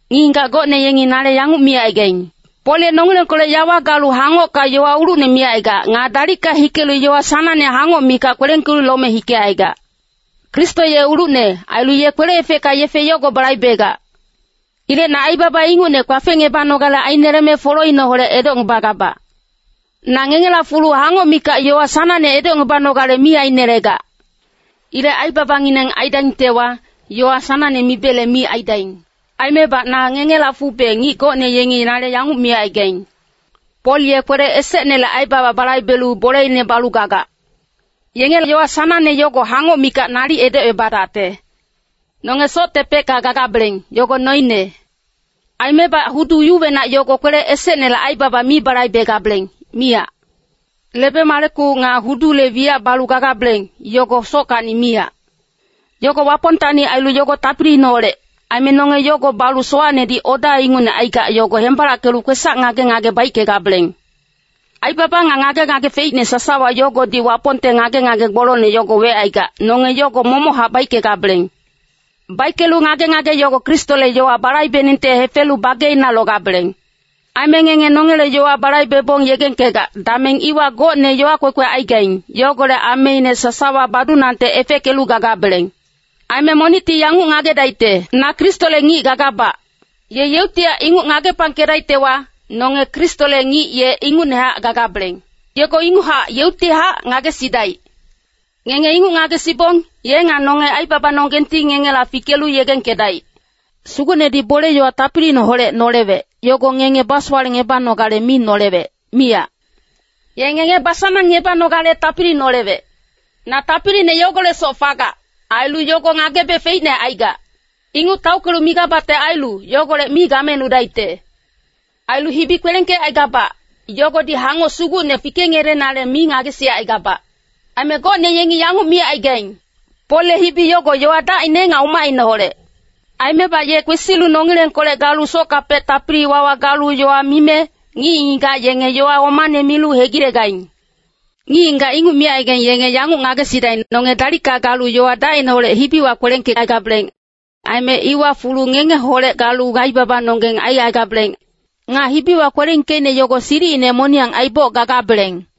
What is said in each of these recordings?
Ngic-ngigac gocne yengi nale yanguc micaigaing, “Pol ye nongilengkolec yawa galu hangocka yowa ulucne micaigac. Nga dalicka hikelu yowa sanangne hangoc mikac kwelengkelu lome hikecaigac.” Kristo ye ulucne. Ailu ye kwele-efecka yefe yogo balaibegac. Ilec na aibaba ingucne kpafengebanogale aineleme foloineholec edocngebagabac. Na ngengela fulu hangoc mikac yowa sanangne edocngebanogale mi ainelegac. Ilec aibabangineng aidaingtewa, yowa sanangne mibele mi aidaing. Aimebac na ngengela fube ngic gocne yengi nale yanguc micaigaing, “Pol ye kwele esecnele aibaba balaibelu boleine balu gagac,” yenge yowa sanangne yogo hangoc mikac nalic edocebadacte. Nonge soctepecka gagabeleng, yogo noine. Aimebac hudu yuwenac yogo kwele esecnele aibaba mi balaibegabeleng, miyac. Lebe-maleku nga hudule wiyac balu gagabeleng, yogo sockacni miyac. Yogo Wapongtacni ailu yogo tapiliineholec. Aime nonge yogo balu sowacnedi oda ingucne aigac yogo hembalackelu kwesac ngage-ngage baickegabeleng. Aibaba nga ngage-ngage feicne sasawa yogodi Wapongte ngage-ngage gbolongne yogo wecaigac, nonge yogo momochac baickegabeleng. Baickelu ngage-ngage yogo Kristole yowa balaibeningte hefelu bageina logabeleng. Aime ngenge nongele yowa balaibebong yegengkegac, dameng iwa gocne yowa kwekwe aigaing, yogolec ameine sasawa badunangte efeckelu gagabeleng. Aime monicti yanguc ngagedaicte, “Na Kristole ngic gagabac.” Ye yeuctihac inguc ngagepangkedaictewa, nonge Kristole ngic ye ingucnehac gagabeleng. Yogo inguchac yeuctihac ngagesidaic. Ngenge inguc ngagesibong, ye nga nonge aibabanonggengti ngengela fikelu yegengkedaic. Sugucnedi bole-yowa tapiliineholec nolewec, yogo ngenge basowalecngebanogale mi nolewec, miyac. Ye ngenge basanangngebanogale tapili nolewec. Na tapiline yogolecsoc fagac, ailu yogo ngagebe feicne aigac. Inguc taockelu migabacte ailu, yogolec mi gamenudaicte. Ailu hibi kwelengkecaigabac, yogodi hangoc sugucne fikengelenale mi ngagesicaigabac. Aime gocne yengi yanguc micaigaing, “Polle hibi yogo yowa dacine nga umacineholec. Aimebac ye kwesilu nongilengkolec galu sockapec tapili-wawa galu yowa mime, ngic-ngigac yenge yowa omane milu hegilegaing.” Ngic-ngigac inguc micaigaing, yenge yanguc ngagesidaing, nonge dalicka galu yowa dacineholec hibiwa kwelengkecaigabeleng. Aime iwa fulu ngengeholec galu aibabanonggeng aicaigabeleng. Nga hibiwa kwelengkeicne yogo silicine moniyang aiboc gagabeleng.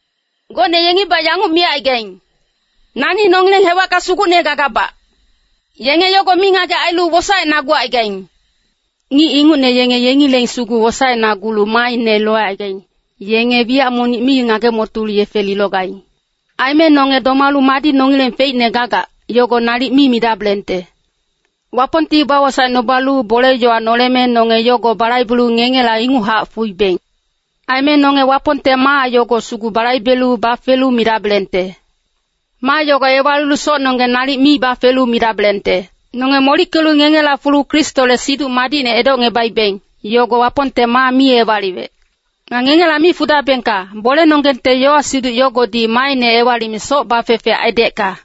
Gocne yengibac yanguc micaigaing, “Nani nongileng hewacka sugucne gagabac.” Yenge yogo mingagec ailu wosaenagucaigaing. Ngic ingucne yenge yengileng sugu wosaecnagulu maaine locaigaing, yenge wiyac monic mi ngage-motolu yefe lilogaing. Aime nonge domalu madi nongileng feicne gagac, yogo nalic mi midabelengte. Wapongti bawosaecnubalu bole-yowa noleme nonge yogo balaibelu ngengela inguchac fuibeng. Aime nonge Wapongte maa yogo sugu balaibelu bafelu midabelengte. Maa yogo ewalilu socnonggeng nalic mi bafelu midabelengte. Nonge molickelu ngengela fulu Kristole Siduc Madicne edocngebaibeng, yogo Wapongte maa mi ewaliwec. Nga ngengela mi fudabengka, bolenonggengte yowa-siduc yogodi maaine ewalime soc bafefe aidecka.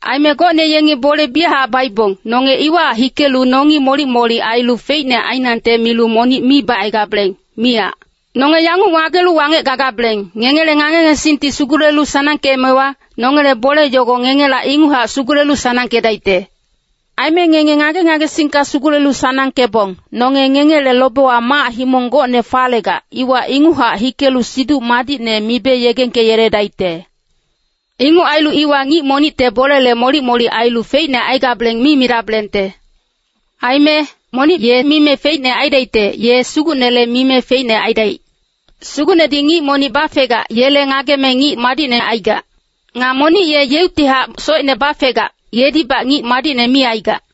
Aime gocne yenge bole biyachac baibong, nonge iwahac hikelu nongi molic-molic ailu feicne ainangte milu monic mi bacaigabeleng, miyac. Nonge yanguc ngagelu wangec gagabeleng, ngengele ngage-ngagesingti sugulelu sanangkeemewa, nongele bole yogo ngengela inguchac sugulelu sanangkedaicte. Aime ngenge ngage-ngagesingka sugulelu sanangkebong, nonge ngengele lobewa mac-himong gocne falegac, iwa inguchac hikelu Siduc Madicne mibe yegengkeyeledaicte. Inguc ailu iwa ngic monicte bolele molic-molic ailu feicne aigabeleng mi midabelengte. Aime “Monic ye mime feicne aidaicte, ye Sugucnele mime feicne aidaic.” Sugucnedi ngic monic bafegac, yele ngageme ngic madicne aigac. Nga monic ye yeuctihac socine bafegac, yedibac ngic madicne mi aigac.